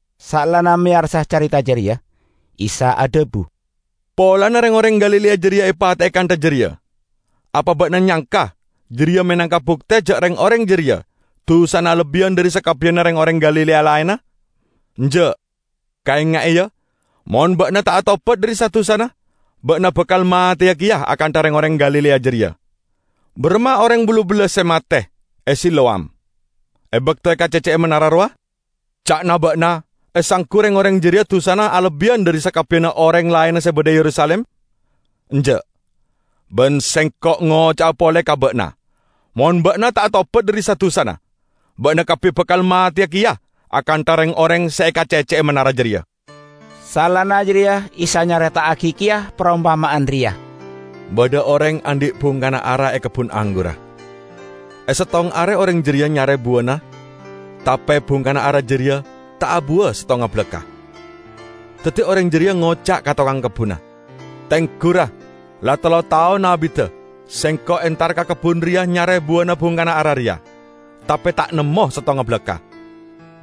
Saellana meyarsa careta jareya, Isa adhabu, "Polana reng-oreng Galilea jareya epate'e kantha jareya, apa ba'na nyangka jareya menangka bukte ja' reng-oreng jareya dusana alebbiyan dhari sakabbiyanna reng-oreng Galilea laenna? Enja'! Kaenga'e, ya: mon ba'na ta' atobat dhari sa-dusana, ba'na bakal mateya keya akantha reng-oreng Galilea jareya. Baramma oreng ballu bellas se mate e Siloam, e bakto ekacecce'e manara rowa? Ca'na ba'na esanggu reng-oreng jareya dusana alebbiyan dhari sakabbiyanna oreng laenna se badha e Yerusalim? Enja'! Ban Sengko' ngoca'a pole ka ba'na: Mon ba'na ta' atobat dhari sa-dusana, ba'na kabbi bakal mateya keya akantha reng-oreng se ekacecce'e manara jareya." Saellana jareya Isa nyareta'agi keya parompama'an reya: "Badha oreng andhi' bungkana ara e kebbun anggurra. E settong are oreng jareya nyare buwana tape bungkana ara jareya ta' abuwa settonga balakka'. Daddi oreng jareya ngoca' ka tokang kebbunna, 'Tenggu, ra, la tello taon abidda sengko' entar ka kebbun reya nyare buwana bungkana ara reya, tape ta' nemmo settonga balakka'.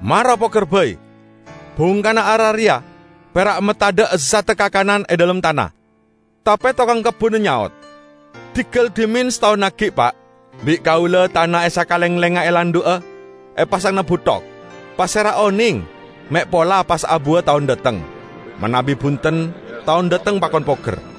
Mara poger bai! Bungkana ara reya pera' matadha' ezzadda kakanan e dhalem tana!' Tape tokang kebbunna nyaot, 'Diggal dhimen sataon aggi', Pa'. Bi' kaula tana e sakalenglengnga elandhu'a, epasangana buthok. Pasera oneng me' pola pas abuwa taon dhateng. Manabi bunten, taon dhateng pakon poger.' "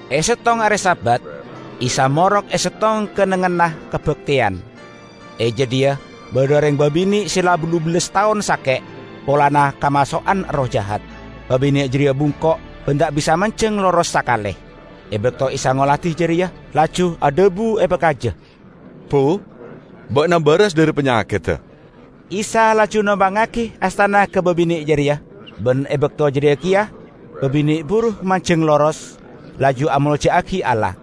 E settong are Sabat, Isa morok e settong kennengnganna kabakteyan. E jadhiya badha oreng babine' se la ballu bellas taon sake', polana kamaso'an erroh jahat. Babine' jareya bungko' ban ta' bisa manjeng loros sakale. E bakto Isa ngoladi jareya, laju adhabu epakaja, "Bu, ba'na baras dhari panyakedda!" Isa laju nompangngagi astana ka babine' jareya, ban e bakto jareya keya babine' buru manjeng loros, laju amolja'agi Allah.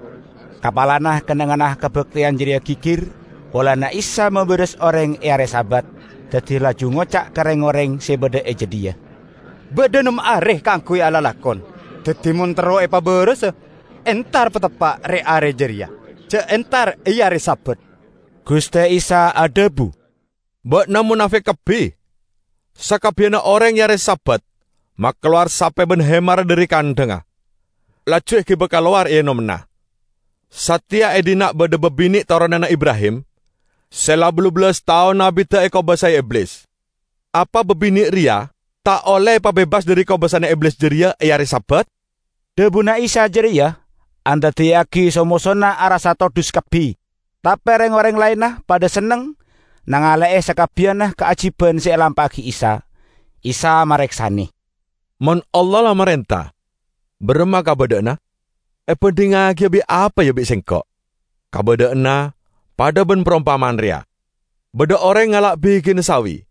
Kapalana kennengnganna kabakteyan jareya gigir, polana Isa mabaras oreng e are Sabat, daddi laju ngoca' ka reng-oreng se badha e jadhiya, "Badha nem are kaangguy alalakon; daddi mon terro epabarasa, entar pateppa' re-are jareya, ja' entar e are Sabat!" Guste Isa adhabu, "Ba'na monafik kabbi! Sakabbiyanna oreng e are Sabat makalowar sape ban hemarra dhari kandhangnga, laju egiba kalowar eenommana. Sateya e dhinna' badha babine' toronanna Ibrahim, se la ballu bellas taon abidda ekobasae Iblis. Apa babine' reya ta' olle epabebas dhari kobasana Iblis jareya e are Sabat?" Dhabuna Isa jareya andaddiyagi so-mosona arassa todhus kabbi; tape reng-oreng laenna padha senneng nangale'e sakabbiyanna kaajiban se elampa'agi Isa. Isa mareksane, "Mon Allah la marenta, baramma kabadha'anna? Ebandhingngagiya bi' apa, ya, bi' Sengko'? Kabadha'anna padha ban parompama'an reya. Badha oreng ngala' bigina sawi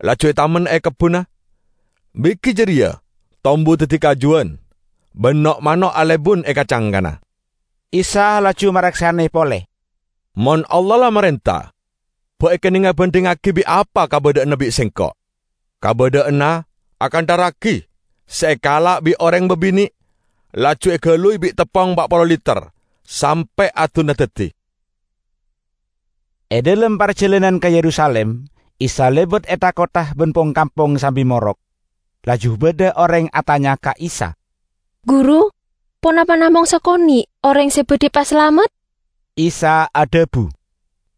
laju etamen e kebbunna. Bigi jareya tombu daddi kajuwan, ban no'-mano' alebun e ka-cangkana." Isa laju mareksane pole, "Mon Allah la marenta, ba' ekennenga bandhingngagi bi' apa kabadha'anna bi' Sengko'? Kabadha'anna akantha ragi se ekala' bi' oreng babine', laju egaluy bi' teppong pa' polo liter sampe' adunna daddi." E dhalem parjalanan ka Yerusalim Isa lebat e tha-kottha ban pong-kampong sambi morok. Laju badha oreng atanya ka Isa, "Guru, ponapa namong sakone' oreng se badhi epasalamet?" Isa adhabu,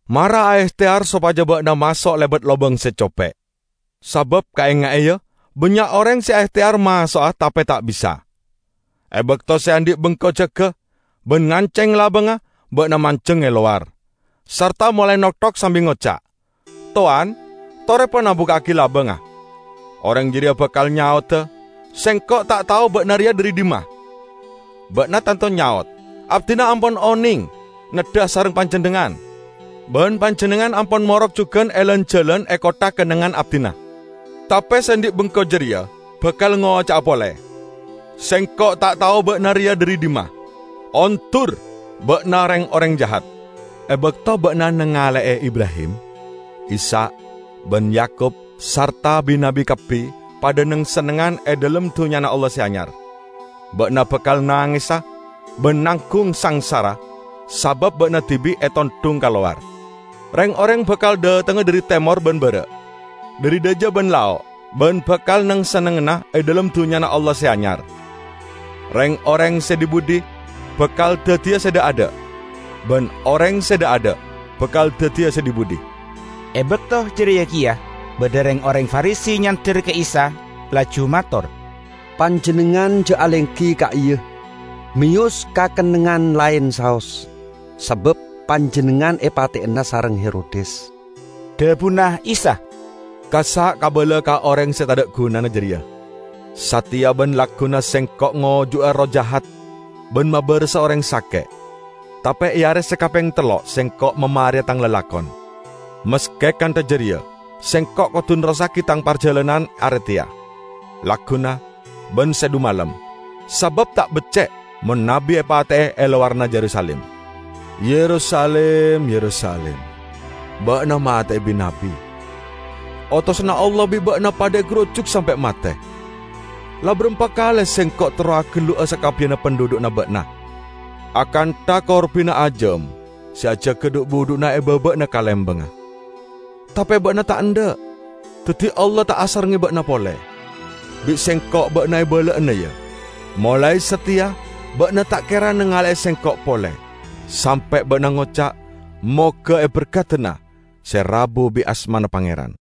"Mara aehteyar sopaja ba'na maso' lebat labang se cope'. Sabab, kaenga'e, ya; bannya' oreng se aehteyar maso'a tape ta' bisa. E bakto se andhi' bengko jaga ban nganceng labangnga, ba'na manjeng e lowar, sarta molae nokthok sambi ngoca', 'Towan, tore pona, bukka'agi labangnga!' Oreng jareya bakal nyaoda, 'Sengko' ta' tao ba'na reya dhari dhimma!' Ba'na tanto nyaot, 'Abdina ampon oneng neddha asareng panjennengngan, ban panjennengngan ampon morok jugan e lan-jalan e kottha kennengngan abdina!' Tape se andhi' bengko jareya bakal ngoca'a pole, 'Sengko' ta' tao ba'na reya dhari dhimma. Ondur, ba'na reng-oreng jahat!' E bakto ba'na nangale'e Ibrahim, Ishak ban Yakub sarta bi-nabbi kabbi padha neng-sennengngan e dhalem Dunnyana Allah Se Anyar, ba'na bakal nangesa ban nanggung sangsara sabab ba'na dibi' etondhung kalowar! Reng-oreng bakal dhatengnga dhari temor ban bara', dhari dhaja ban lao', ban bakal neng-sennengngana e dhalem Dunnyana Allah Se Anyar. Reng-oreng se dhi-budhi bakal daddiya se dha'-adha', ban oreng se dha'-adha' bakal daddiya se dhi-budhi." E bakto jareya keya, badha reng-oreng Farisi nyander ka Isa, laju mator, "Panjennengngan ja' alenggi e ka'iya! Meyos ka kennengngan laen saos, sabab Panjennengngan epateyana sareng Herodes." Dhabuna Isa, "Kassa' kabala ka oreng se tadha' gunana jareya: 'Sateya ban lagguna Sengko' ngojuga erroh jahat ban mabarasa oreng sake', tape e are se kapeng tello' Sengko' mamareya Tang lalakon.' Maske kantha jareya Sengko' kodu nerrossagi Tang parjalanan are teya, lagguna ban sadhumalem, sabab ta' becce' mon nabbi epate'e e lowaranna Yerusalim. Yerusalim, Yerusalim! Ba'na mate'e bi-nabbi. Otosanna Allah bi' ba'na padha egarujuk sampe' mate! La barampa kale Sengko' terro agellu'a sakabbiyanna pandhudhu'na ba'na akantha korbina ajam se ajaga dhu'-budhu'na e baba'anna kalembangnga, tape ba'na ta' endha'! Daddi Allah ta' asarengnge ba'na pole. Bi' Sengko' ba'na ebala'ana, ya: molae sateya ba'na ta' kera nangale'e Sengko' pole, sampe' ba'na ngoca', 'Moga eberkadana se rabu bit asmana Pangeran.' "